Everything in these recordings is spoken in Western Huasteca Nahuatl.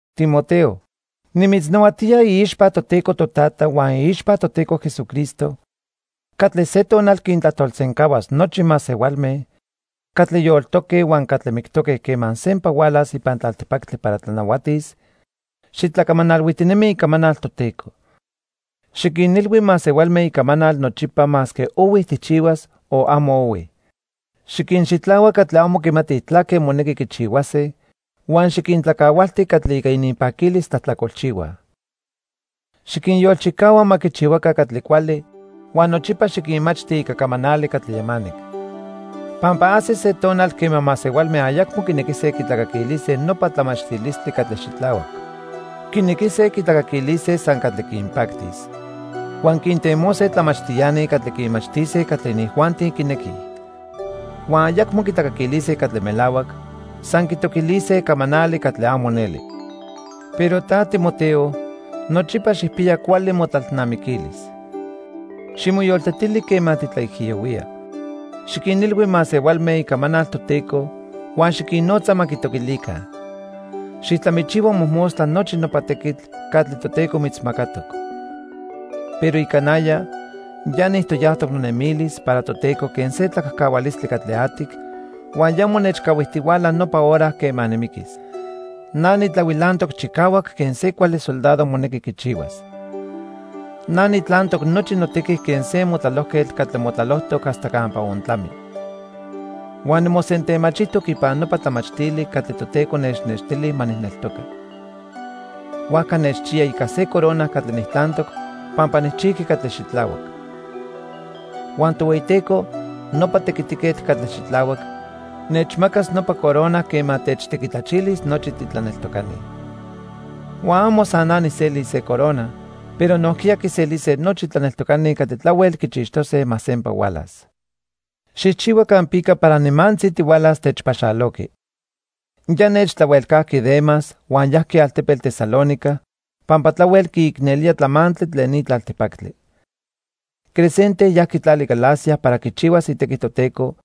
Timoteo, nimitznahuatía iixpa Toteco Totata huan iixpa Toteco Jesucristo catli se tonal quintlajtolsencahuas nochi masehualme catli yoltoque huan catli mictoque quema sempa hualas ipan tlaltipactli para tlanahuatis, xitlacamanalhuijtinemi icamanal Toteco. Xiquinilhui masehualme icamanal nochipa masque ohui tijchihuas o amo ohui. Xiquinxitlahua catli amo quimatij tlaque monequi quichihuase huan xiquintlacahualti catli ica ininpaquilis tlajtlacolchihuaj. Xiquinyolchicahua ma quichihuaca catli cuali huan nochipa xiquinmachti ica camanali catli yamanic. Pampa ajsis se tonal quema masehualme ayacmo quinequise quitlacaquilise nopa tlamachtilistli catli xitlahuac. Quinequise quitlacaquilise san catli quinpactis. Huan quintemose tlamachtiani catli quinmachtise catli inijuanti quinequij. Huan ayacmo quitlacaquilise catli melahuac, san quitoquilise camanali catli amo neli. Pero ta, Timoteo, nochipa xijpiya cuali motlalnamiquilis. Ximoyoltetili quema titlaijiyohuía. Xiquinilhui masehualme icamanal Toteco huan xiquinnotza ma quitoquilica. Xijtlamichihua mojmostla nochi nopa tequitl catli Toteco mitzmacatoc. Pero ica naya, ya nijtoyajtoc nonemilis para Toteco quen se tlacajcahualistli catli atic, huan ya monechcahuijtihuala nopa hora quema nimiquis. Na nitlahuilantoc chicahuac quen se cuali soldado monequi quichihuas. Na nitlantoc nochi notequi quen se motlalojquetl catli motlalojtoc hasta campa ontlami. Huan nimosentemachijtoc ipan nopa tlamachtili catli Toteco nechnextili ma nijneltoca. Huajca nechchiya ica se corona catli nijtlantoc pampa nijchijqui catli xitlahuac. Huan Tohueyiteco, nopa tequitiquetl catli xitlahuac, nechmacas nopa corona quema techtequitlachilis nochi titlaneltocani. Huan amo san na nijselis se corona, pero nojquiya quiselise nochi tlaneltocani catli tlahuel quichixtose ma sempa hualas. Xijchihua campica para nimantzi tihualas techpaxaloqui. Ya nechtlahuelcajqui Demas huan yajqui altepetl Tesalónica pampa tlahuel quiicnelía tlamantli tlen ni tlaltipactli. Crescente yajqui tlali Galacia para quichihuas itequi Toteco,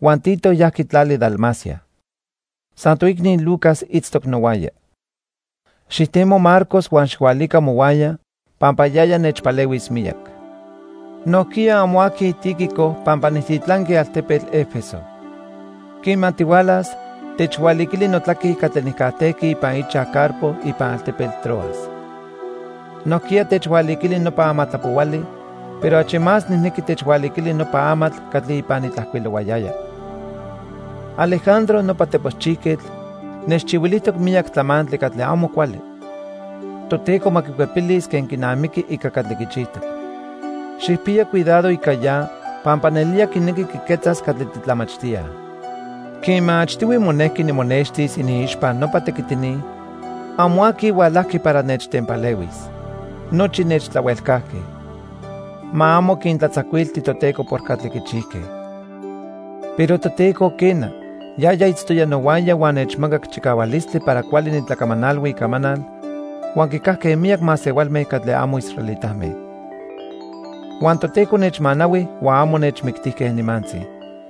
huan Tito yajqui tlali Dalmacia. San toicni Lucas itztoc nohuaya. Xijtemo Marcos huan xijhualica mohuaya pampa yaya nechpalehuis miyac. Nojquiya amo aqui Tíquico pampa nijtitlanqui altepetl 'Efeso. Quema tihualas, techhualiquili notlaque catli nijcajtejqui ipan ichaj Carpo ipan altepetl Troas. Nojquiya techhualiquili nopa amatlapohuali, pero achi más nijnequi techhualiquili nopa amatl catli ipan nitlajcuilohuayaya. Alejandro nopa teposchijquetl nechchihuilijtoc miyac tlamantli catli amo cuali. Toteco ma quicuepilis quen quinamiqui ica catli quichijtoc. Xijpiya cuidado ica ya pampa nelía quinequi quiquetzas catli titlamachtíaj. Quema achtihui monejqui nimonextis iniixpa nopa tequitini, amo aqui hualajqui para nechtempalehuis. Nochi nechtlahuelcajque. Ma amo quintlatzacuilti Toteco por catli quichijque. Pero Toteco, quena, yaya itztoya nohuaya huan nechmacac chicahualistli para cuali nitlacamanalhui icamanal huan quicajque miyac masehualme catli amo israelitame. Huan Toteco nechmanahui huan amo nechmictijque nimantzi.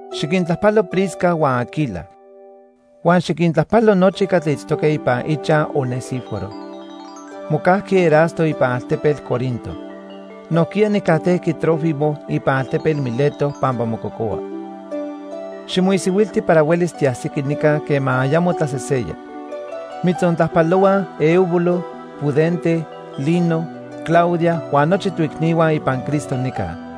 Xiquintlajpalo Prisca huan Aquila. Huan xiquintlajpalo nochi catli itztoque ipan ichaj Onesíforo. Mocajqui Erasto ipan altepetl Corinto. Nojquiya nijcajtejqui Trófimo ipan altepetl Mileto pampa mococohua. Ximoisihuilti para huelis tiajsiqui nica quema ayamo tlaseseya. Mitzontlajpalohuaj Eubulo, Pudente, Lino, Claudia huan nochi toicnihua ipan Cristo nica.